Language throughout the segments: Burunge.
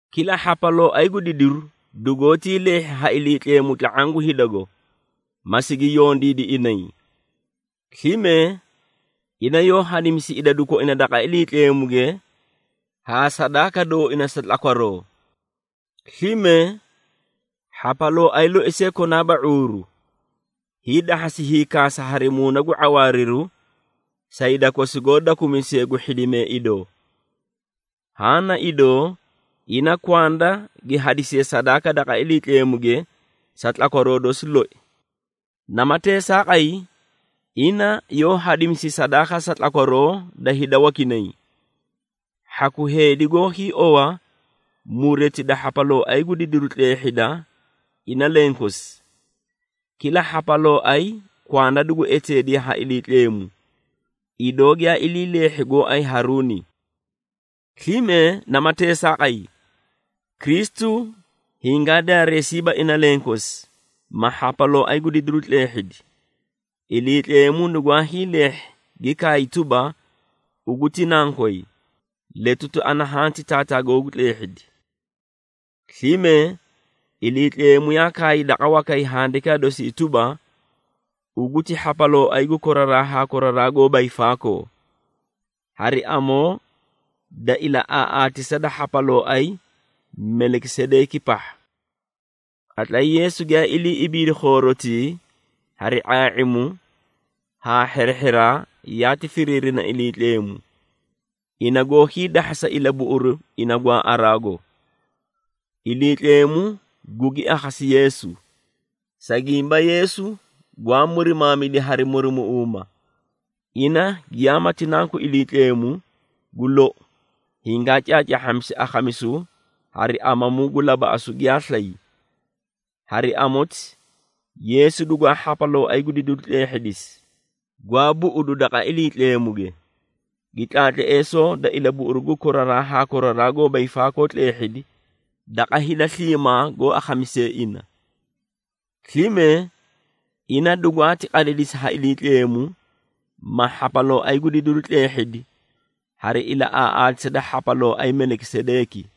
Kila hhapalooay gu didiru dugoótii leehhi ha Iliitleemu tla⁄aã gu hidago, ma sigi yondiidi inay. Slime, ina yoó hadimisi idadu koina daqa Iliitleemuge haa sadaaka dooina sa tlakwaroo. Slime, hhapalooay loi see konaaba ⁄uuru, hiidahhasi hiikaasa hari muuna gu ⁄awaariru sa hida kosi goó dakumisee gu hhidimee idoo. Haã na idoo, ina kwanda gi hadisiye sadaaka daqa Iliitleemuge sa tlakwaroo dosi loi. Nama teesaaqay, ina yoó hadimisi sadaaka sa tlakwaroo da hida wakinay. Hhaku heedi goó hiiowa mureti da hhapalooay gu didiru tleehhida ina lenkosi. Kila hhapalooay kwanda dugu eteediye ha Iliitleemu, idoo giyaa ilii leehhi gooay Haruuni. Slime nama teesaaqay, Kristu hingaa daareesiiba ina lenkosi, ma hhapalooay gu didiru tleehhidi. Iliitleemu nugwaa hiileehhi gi kaay tuba, “Ugu ti nankoy, letuti ana hanti taataa googu tleehhidi.” Slime Iliitleemu yaa kaay daqa wakay Handikaa dosi tuba, “Ugu ti hhapalooay gu koraraa haa koraraa goóba hiifaakoo, hari amoo da ilaꞌaaꞌaatisa da hhapalooay Melikisedeeki pahha.” Qatlay Yeesu giyaa ilii ibiidi khoorotii, hari ⁄aa⁄imu haa hherehheraa yaati firiirina Iliitleemu, ina goó hiidahhasa ilabuꞌuru ina gwaaꞌaraago. Iliitleemu gugi akhasi Yeesu, sa gimba Yeesu gwaa murimaamidi hari murumuꞌuuma. Ina giyaamati Nanku Iliitleemu, gu lou hingaa caacaahhamisi akhamisu hari amamu gu labaꞌasu giyaa slay. Hari amoti, Yeesu dugwaa hhapalooay gu didiru tleehhidisi gwaa buꞌudu daqa Iliitleemuge, gi tlaatleesoo da ilabuꞌuru gu koraraa haa koraraa goóba hiifaakoo tleehhidi daqa hida sliimaa goó akhamisee ina. Slime, ina dugwaati qadidisi ha Iliitleemu, ma hhapalooay gu didiru tleehhidi hari ilaꞌaaꞌaatisa da hhapalooay Melikisedeeki.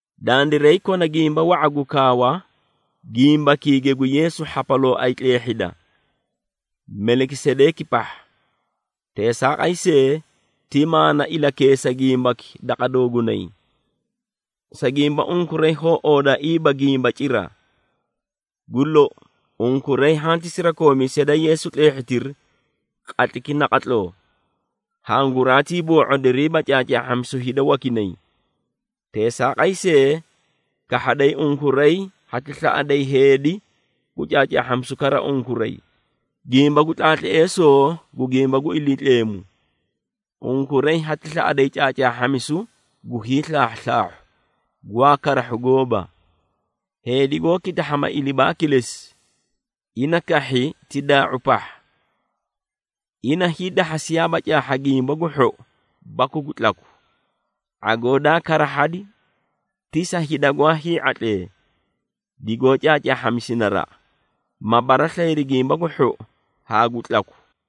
Dandiray kona gimba wa⁄a gu kaawa, gimbakiige gu Yeesu hhapalooay tleehhida, Melikisedeeki pahha. Teesaaqay see, ti maana ilakeesa gimbaki daqa doogunay, sa gimba unkuray hoó oodaaiiba gimba cira. Gu lou, unkuray hanti sirakoomiisee da Yeesu tleehhitiri qatlayki naqatloo, hanguraatii boo⁄odiriiba caacaahhamisu hida wakinay. Teesaaqay see, kahhaday unkuray hati slaꞌayda heedi gu caacaahhamisu kara unkuray, gimba gu tlaatleesoo gu gimba gu Iliitleemu. Unkuray hati slaꞌaday caacaahhamisu gu hiislaahhuslaahhu gwaa karahhu gooba. Heedi goó kitahhama ilibaa kilesi, ina kahhi ti daa⁄u pahha. Ina hiidahhasiyaaba caahha gimba gu hhou baku gu tlaku. ⁄agoo daa karahhadi ti sa hida gwaa hii⁄atlee, digoó caacaahhamisi naraꞌa, ma baraslayiri gimba gu hhou haa gu tlaku.